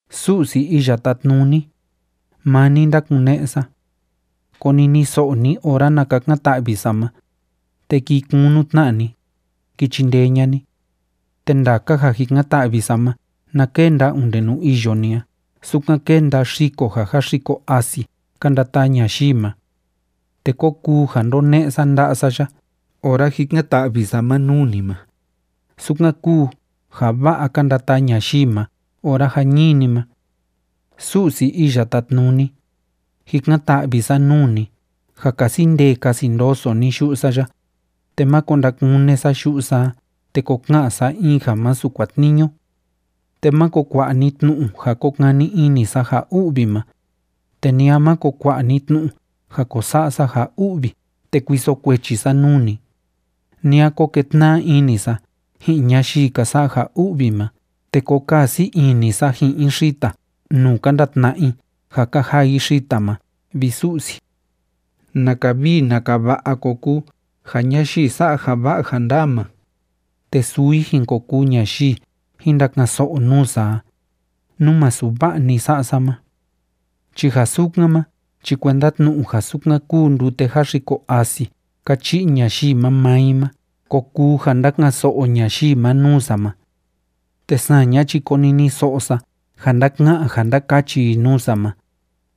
Su'si Iya Tátnuni, maa ni ndákune'e sa. Koniniso'o ni ora na kakan‑ta'vi sa ma, te kii kunu tna ni, ki chindee ña'a ni. Te ndaka ja jikan‑ta'vi sa ma na kenda onde nuu iyo ni a sukan kénda xiko ja jáxiko asi ka ndataa ñayii ma. Te kó kuu ja ndóne'e sa nda'a sa ya ora jikan‑ta'vi sa ma nuu ni ma, sukan kúu ja va'a ka ndataa ñayii ma ora jañini ma. Su'si Iya Tátnuni, jikan‑ta'vi sa nuu ni ja kasi ndee kasi ndoso ni yu'u sa ya, te máko ndakune sa yu'u sa a te ko ka'an sa in ja masu kuatniñu. Te máko kua'a ni tnu'u ja ko kani ini sa ja u'vi ma, te ni a máko kua'a ni tnu'u ja ko sa'a sa ja u'vi te kuiso kuechi sa nuu ni, ni a ko ketna'a ini sa ji'in ñayii ka sa'a ja u'vi ma te ko kaa sii ini sa ji'in i xita nuu ka ndatna'a i ja ka jaa i xita ma, vi Su'si. ¡Naka vii naka va'a ko kuu ja ñayii sa'a ja va'a ja ndaa ma, te suu i jin ko kuu ñayii jin ndaka'an‑so'o nuu sa a, nú masu va'a‑ni sa'a sa ma! Chi ja sukan ma chi kuenda tnu'u ja sukan kúu ndute jáxiko asi ka chi'i ñayii ma maa i ma ko kuu ja ndaka'an‑so'o ñayii ma nuu sa ma. Te saña chi koniniso'o sa ja ndaka'an ja ndakachi i nuu sa ma,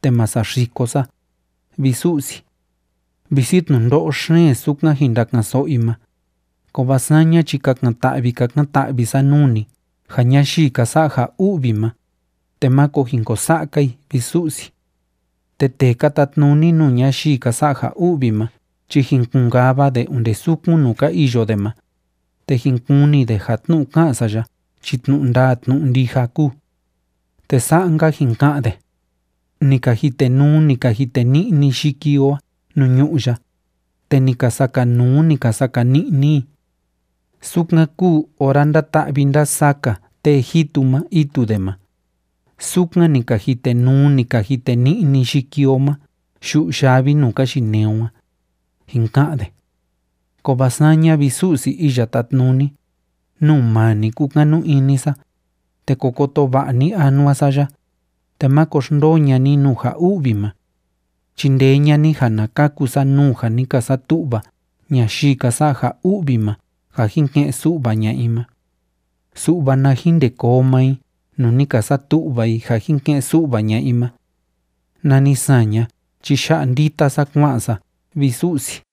te ma saxiko sa, vi Su'si. Visi tnundo'o xeen sukan jin ndaka'an‑so'o i ma, kovaa saña chi kakan‑ta'vi kakan‑ta'vi sa nuu ni ja ñayii ka sa'a ja u'vi ma, te máko jin ko sa'a‑ka i, vi Su'si. Te tee ka tatnuni nuu ñayii ka sa'a ja u'vi ma chi jin kun‑kava de onde sukun nuu ka iyo de ma, te jin kuni de ja tnu'u ká'an sa ya chi tnu'u ndaa tnu'u ndija kúu. Te sa'a‑nka jin ka'an de: “Ni ka jitenuu, ni ka jiteni'ni yiki o a nuu ñu'ú ya, te ni ka sakanuu, ni ka sakani'ni i. Sukan kúu ora ndáta'vi ndásaka tee jitu ma itu de ma, sukan ni ka jitenuu, ni ka jiteni'ni yiki o ma yu'u yavi nuu ka yinee o a”, jin ka'an de. Kovaa saña, vi Su'si Iya Tátnuni, nuu maa ni kúkanu ini sa, te ko koto va'a ni anua sa ya, te máko xndoo ña'a ni nuu ja u'vi ma. Chindee ña'a ni ja na kaku sa nuu ja ni ka satu'va ñayii ka sa'a ja u'vi ma ja jin ke'en su'va ña'a i ma. Su'va na jin ndê koo maa i nuu ni ka satu'va i ja jin ke'en su'va ña'a i ma, nani saña chi ya'a ndita sa kua'an sa, vi Su'si.